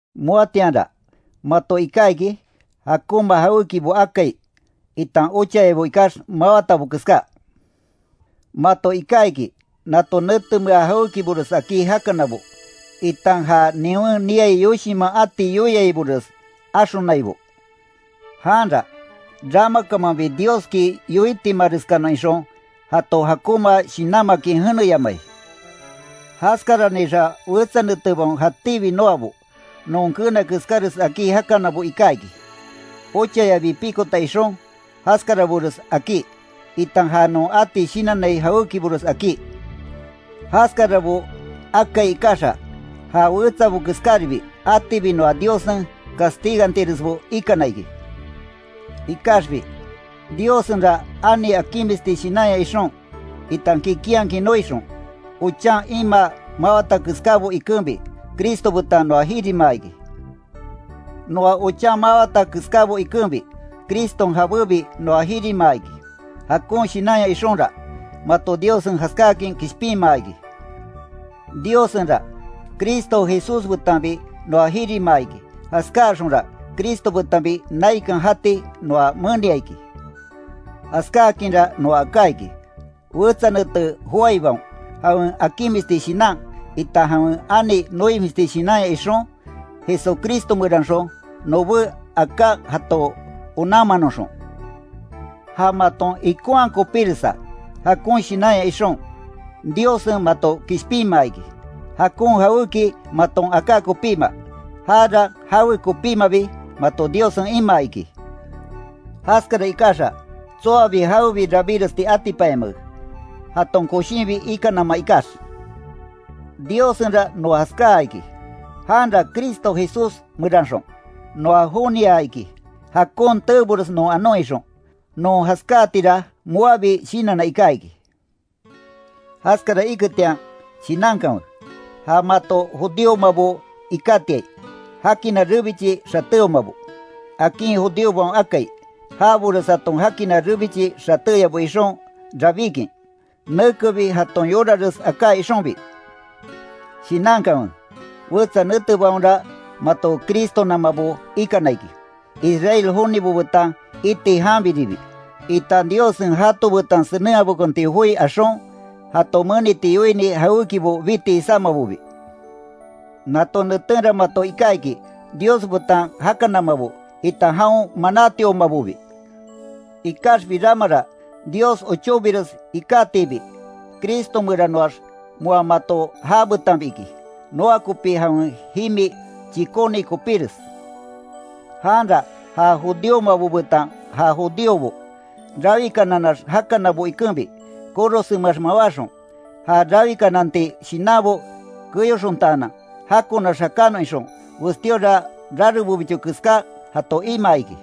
Moatianra mato iká iki, jakonma jawékibo akai, itan ochayabo ikax, mawatabo keská. Mato iká iki, nato netemea jawékibores akí jakanabo, itan ja niwen niai yoshinman ati yoiaibores, axonaibo. Janra, ramakamanbi Dioski yoitimareskanon ixon, jato jakonma shinanmakin jeneyamai. Jaskaranixa wetsa netebaon jatíbi noabo, non keena keskáres akí jakanabo iká iki, ochayabi pikota ixon, jaskarabores akí, itan ja non ati shinannai jawékibores akí. Jaskarabo akai ikaxa, ja wetsabo keskáribi, atibi noa Diossen castigantiresbo ikana iki. Ikaxbi, Diossenra ani akinmisti shinanya ixon, itan kikinhakin noixon, ochan imaa mawata keskábo ikenbi, Cristo betan noa jirimaa iki. Noa ochan mawata keskábo ikenbi, Criston jabébi noa jirimaa iki. Jakon shinanya ixonra, mato Diossen jaskáakin kishpinmaa iki. Diossenra, Cristo Jesús betanbi noa jirimaa iki, jaskáaxonra Cristo betanbi naikan jati noa menia iki. Jaskákinra noa aká iki, wetsa nete joaibaon, jawen akinmisti shinan, itan jawen ani noimisti shinanya ixon, Jesucristo meranxon, nobé aká jato onanmanoxon. Ja maton ikonhaa kopíresa, jakon shinanya ixon, Diossen mato kishpinmaa iki, jakon jawéki maton aká kopíma, jara jawe kopímabi, mato Diossen imaa iki. Jaskara ikaxa, tsoabi jawebi rabíresti atipanyamake, jaton koshinbi ikanama ikax. Diossenra noa jaskaa iki. Janra Cristo Jesús meranxon, noa jonia iki, jakon teebores non anon ixon, non jaskáatira, moabi shinanna iká iki. Jaskara iketian, shinankanwe, ja mato judíomabo ikátiai, “jakina rebichi xatéomabo”, akin judíobaon akai, jabores jaton jakina rebichi xatéyabo ixon rabíkin, nekebi jaton yorares aká ixonbi. Shinankanwe, wetsa netebaonra mato Cristonamabo ikana iki, Israel jonibo betan iti janbiribi, itan Diossen jato betan senenhabekonti joi axon, jato meniti yoini jawékibo biti jisámabobi. Nato netenra mato iká iki, Dios betan jakanamabo, itan jaon manátiomabobi. Ikaxbi ramara, Dios ochóbires ikatiibi, Cristo meranoax moa mato jabetanbi iki, noa kopí jawen jimi chikóni kopíres. Janra ja judíomabo betan ja judíobo, rawikananax jakanabo ikenbi, korosenmeax mawáxon, ja rawikananti shinanbo keyoxontaanan, jakonax jakanon ixon, westíora rarebobicho keská, jato imaa iki.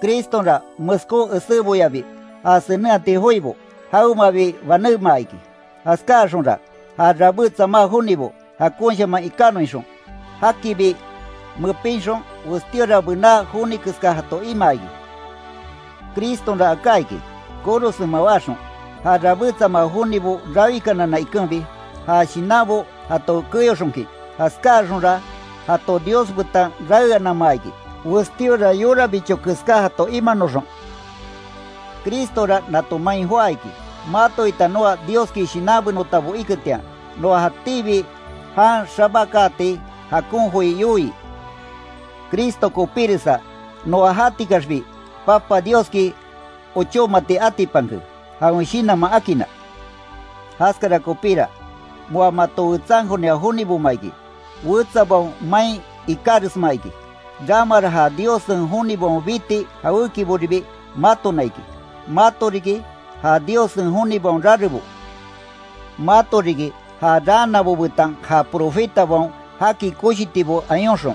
Cristonra meskó eséboyabi ja senenhati joibo, jawemabi banémaa iki, jaskáaxonra, ja rabé tsamá jonibo, jakonshaman ikanon ixon, jakibi mepinxon, westíora bená joni keska jato imaa iki. Cristonra aká iki, korosen mawáxon, ja rabé tsamá jonibo rawikanana ikenbi, ja shinanbo jato keyoxonkin, jaskáaxonra jato Dios betan raeanamaa iki, westíora yorabicho keská jato imanoxon. Cristora nato main joá iki, mato itan noa Dioski shinanbenotabo iketian, noa jatíbi jan xabakaati, jakon joi yoii. Cristo kopíresa, noa jatikaxbi Papa Dioski ochómaati atipanke, jawen Shinanman akinna. Jaskara kopíra, moa mato wetsankonia joniboma iki, wetsabaon main ikáresma iki, ramara ja Diossen jonibaon biti jawékiboribi matona iki, mato riki, ja Diossen jonibaon rarebo. Mato riki, ja raanabo betan ja profetabaon jaki koshitibo ayonxon,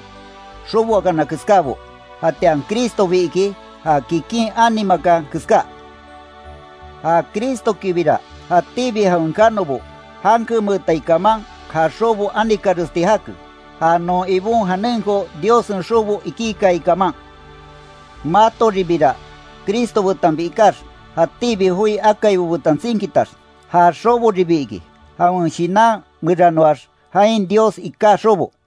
xoboakana keskábo. Jatian Cristobi iki ja kikin ani makan keska. Ja Cristokibira, jatíbi jawen kanobo, jankemeetai kaman, ja xobo anikaresti jake, ja non Ibon janenko Diossen xobo iki kaai kaman. Matoribira, Cristo betanbi ikax, jatíbi joi akaibo betan tsinkitax, ja xoboribi iki, jawen Shinan meranoax jain Dios iká xobo.